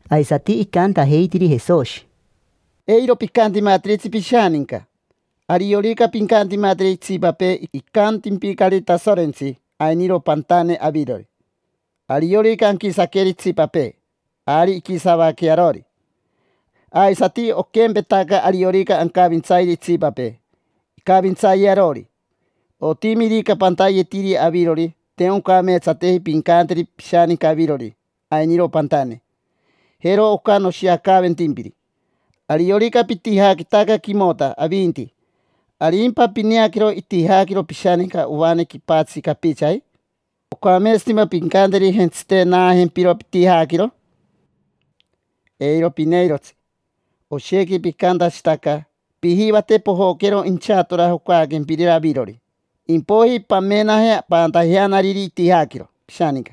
Aisati icantajeitiri Jesoshi: —Eiro picantimatiritsi pishaninca. Ariorica pincantimateri itsipapee, icantimpicari Tasorentsi: “Ainiro pantane avirori”. Ariorica anquisaqueri itsipapee, ari inquisavaquee arori; aisati oquempetaca, ariorica ancavintsayeri itsipapee, incavintsayee arori. Otimirica pantayetiri avirori, te oncameetsateji pincanteri pishaninca avirori: “Ainiro pantane”. Jero oca noshiacaventempiri: ariorica pitijaquitaca quimota avinti, ¿arimpa pineaquero itijaquiro pishaninca ovane quipatsi capichaji? ¿Ocameetsatimpa pincanteri: “Jentsite, naajempiro pitijaquiro”? Eiro pineirotsi. Oshequi picantashitaca. Pijivate pojoquero inchatora jocaaquempirira avirori, impoiji pamenaje paantajeanariri itijaquiro pishaninca.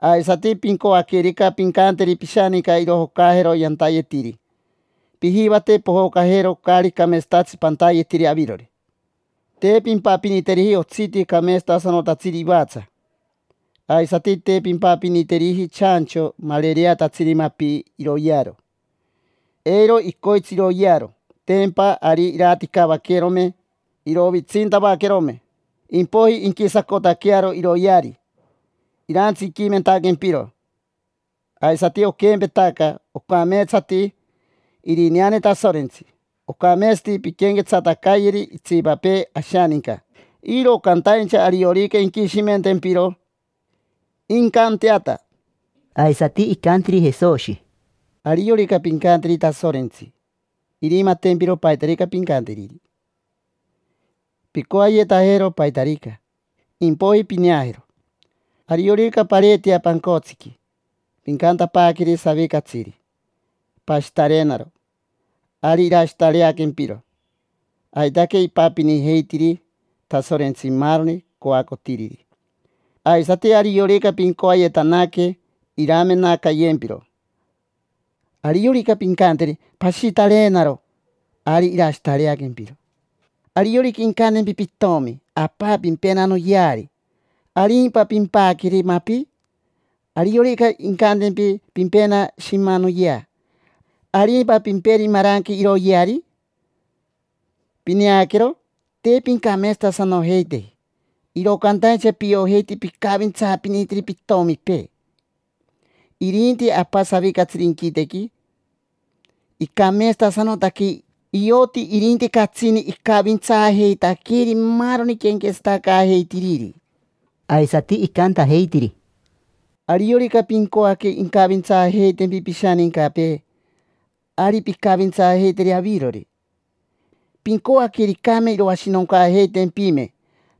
Aisati pincoaquerica pincanteri pishaninca irojocajero yantayetiri, pijivate pojocajero caari cameetsatatsi pantayetiri avirori. Te pimpapiniteriji otsiti cameetsatasanotatsiri ivatsa. Aisati te pimpapiniteriji chancho marereatatsiri mapi iroyearo, eiro icoitsi iroyearo. Tempa ari iraticavaquerome, irovitsintavaquerome, impoiji inquisacotaquearo iroyeari, irantsiquimentaquempiro. Aisati oquempetaca, ocameetsati irineane Tasorentsi. Ocameetsati pinquenquetsatacayeri itsipapee ashaninca, iro cantaincha ariorica inquishimentempiro, incanteata. Aisati icantiri Jesoshi: —Ariorica pincanteri Tasorentsi, irimatempiro paitarica pincanteriri. Pincoayetajero paitarica, impoiji pineajero. Ariorica pareetea pancotsiqui, pincantapaaqueri savicatsiri: “Pashitareenaro”, ari irashitareaquempiro. Aitaque ipapinijeitiri Tasorentsi maaroni coacotiriri. Aisati ariorica pincoayetanaque, iramenacayempiro. Ariorica pincanteri: “Pashitareenaro”, ari irashitareaquempiro. Ariorica incantempi pitomi: “Apa, pimpena noyeari”, ¿arimpa pimpaqueri mapi? Ariorica incantempi: “Pimpena shima noyea”, ¿arimpa pimperi maranque iroyeari? Pineaquero, te pincameetsatasanojeiteji, iro cantaincha piojeiti picavintsaapinitiri pitomipee. Irinti Apa savicatsiri inquitequi icameetsatasanotaque, ioti irinti catsini icavintsaajeitaqueri maaroni quenquetsatacaajeitiriri. Aisati icantajeitiri: —Ariorica pincoaque incavintsaajeitempi pishanincapee, ari pincavintsaajeiteri avirori. Pincoaquericame iroashinoncaajeitempime,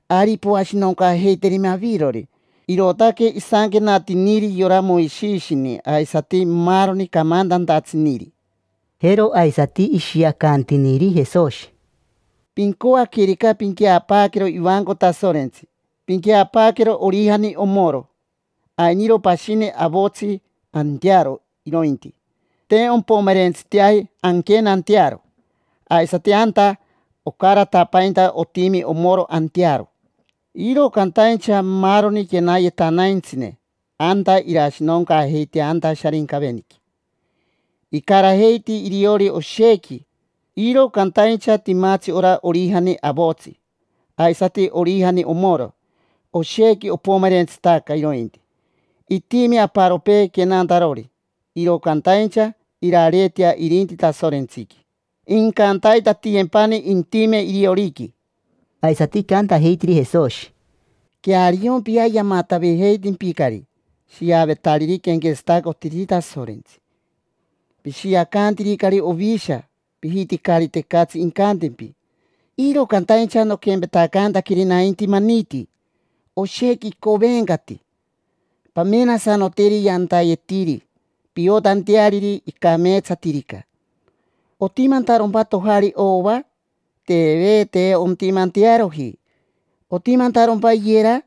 ari poashinoncaajeiterime avirori. Irootaque isanquenatiniri yora Moishishini aisati maaroni camantantatsiniri. Jero aisati ishiacantiniri Jesoshi: —Pincoaquerica pinqueapaaquero ivanco Tasorentsi, pinqueapaaquero orijani omoro. Ainiro pashini avotsi, antearo irointi, te ompomerentsiteaji anquenantearo, aisati anta ocaratapainta otimi omoro antearo. Iro cantaincha maaroni quenayetanaintsine anta irashinoncaajeitea anta Sharincaveniqui. Icarajeiti iriori oshequi. Iro cantaincha timatsi ora orijani avotsi, aisati orijani omoro. Oshequi opomerentsitaca irointi, itimi aparopee quenantarori. Iro cantaincha irareetea irinti Tasorentsiqui, incantaitatiyempani intime irioriqui. Aisati icantajeitiri Jesoshi: —Queariompia, yamatavijeitimpicari shiavetariri quenquetsatacotiriri Tasorentsi. Pishiacantiricari ovisha, pijiticari tecatsi incantempi; iro cantaincha noquempetacantaqueri nainti maniti: oshequi icovencati. Pamenasanoteri yantayetiri, piotanteariri icameetsatirica. ¿Otimantarompa tojari ova? Teve, te ontimantearoji. ¿Otimantarompa iyera?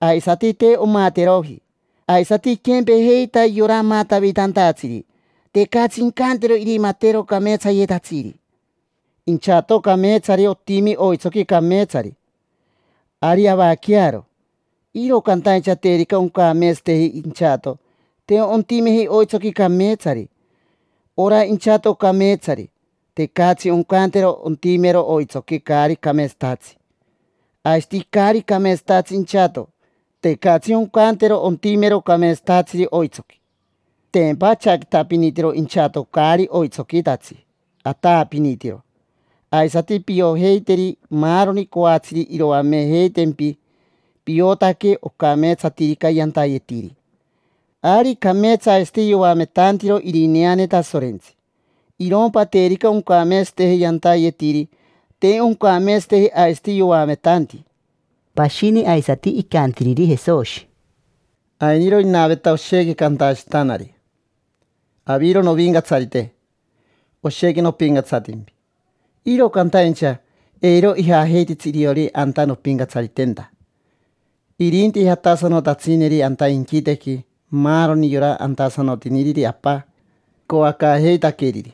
Aisati te omateroji. Aisati iquempejeita yora amatavitantatsiri: tecatsi incantero irimatero cameetsayetatsiri. Inchato cameetsari otimi oitsoqui cameetsari, ari avaquearo. Iro cantaincha terica oncameetsateji inchato, te ontimeji oitsoqui cameetsari. Ora inchato cameetsari, tecatsi oncantero ontimero oitsoqui caari cameetsatatsi. Aisati caari cameetsatatsi inchato, tecatsi oncantero ontimero cameetsatatsiri oitsoqui. Tempa achaquitapinitiro inchato caari oitsoquitatsi, ataapinitiro. Aisati piojeiteri maaroni coatsiri iroamejeitempi. Piotaque ocameetsatirica yantayetiri, ari cameetsa aisati yoametantiro irineane Tasorentsi. Irompa terica oncameetsateji yantayetiri, te oncameetsateji aisati yoametanti. Pashini aisati icantiriri Jesoshi: —Ainiro inaveta oshequi cantashitanari: “Aviro novincatsarite, oshequi nopincatsatimpi”. Iro cantaincha eiro ijajeititsi iriori anta nompincatsaritenta. Irinti jatasanotatsineri anta inquitequi maaroni yora antasanotiniriri Apa icoacaajeitaqueriri.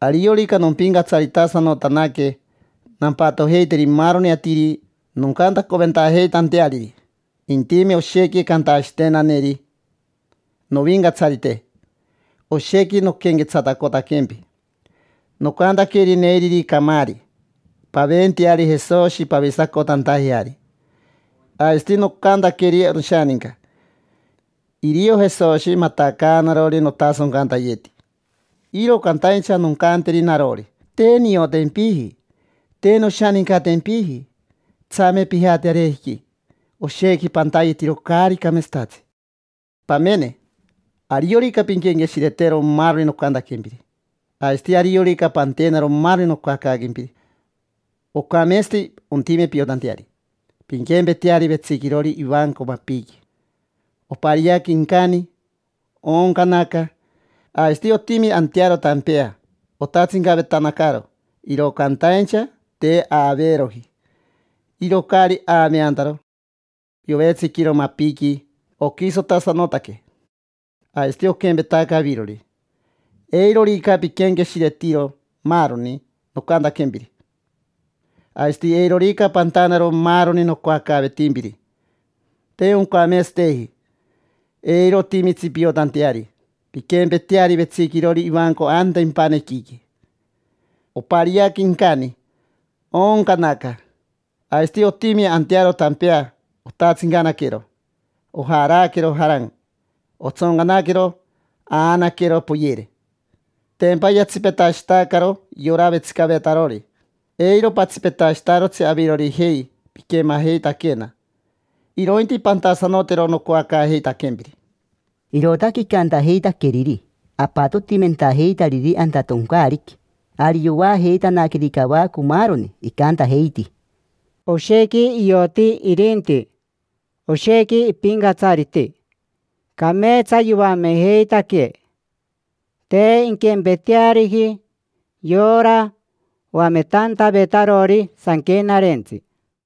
Ariorica nompincatsaritasanotanaque nampatojeiteri maaroni atiri noncantacoventajeitanteariri. Intime oshequi cantashitenaneri: “Novincatsarite, oshequi noquenquetsatacotaquempi. Nocantaqueri neiriri camaari: ‘Paventeari Jesoshi pavisacotantajeari’. Aisati nocantaqueri noshaninca: ‘Irio Jesoshi matacaanarori notasoncantayeti’”. Iro cantaincha noncanteri narori: “Te niotempiji, te noshanincatempiji. Tsame pijate arejiqui, oshequi pantayetiro caari cameetsatatsi”. Pamene, ariorica pinquenqueshiretero maaroni nocantaquempiri, aisati ariorica pantenaro maaroni nocoacaaquempiri, ocameetsati. Ontime piotanteari, pinquempeteari vetsiquirori ivanco mapiqui. Opariaque incani, ooncanaca. Aisati otimi antearo tampea otatsincavetanacaro, iro cantaincha te aaveeroji. Iro caari aaveantaro, yovetsiquiro mapiqui, oquisotasanotaque. Aisati oquempetaca avirori, eirorica piquenqueshiretiro maaroni nocantaquempiri, aisati eirorica pantanaro maaroni nocoacaavetimpiri, te oncameetsateji. Eiro otimitsi piotanteari. Pinquempeteari vetsiquirori ivanco anta impanequiqui. Opariaque incani, ooncanaca. Aisati otimi antearo tampea, otatsincanaquero. Ojaraaquero, jaran; otsoncanaquero, aanaquero, poyere. Tempa yatsipetashitacaro yora vetsicavetarori. Eiro patsipetashitarotsi avirorijei piquemajeitaquena, irointi pantasanotero nocoacaajeitaquempiri. Irootaque icantajeitaqueriri apatotimentajeitariri anta toncaariqui, ari yoajeitanaqueri cavaco maaroni. Icantajeiti: —Oshequi ioti irinti, oshequi ipincatsariti, cameetsa yoamejeitaquee; te inquempeteariji yora oametantavetarori Sanquenarentsi.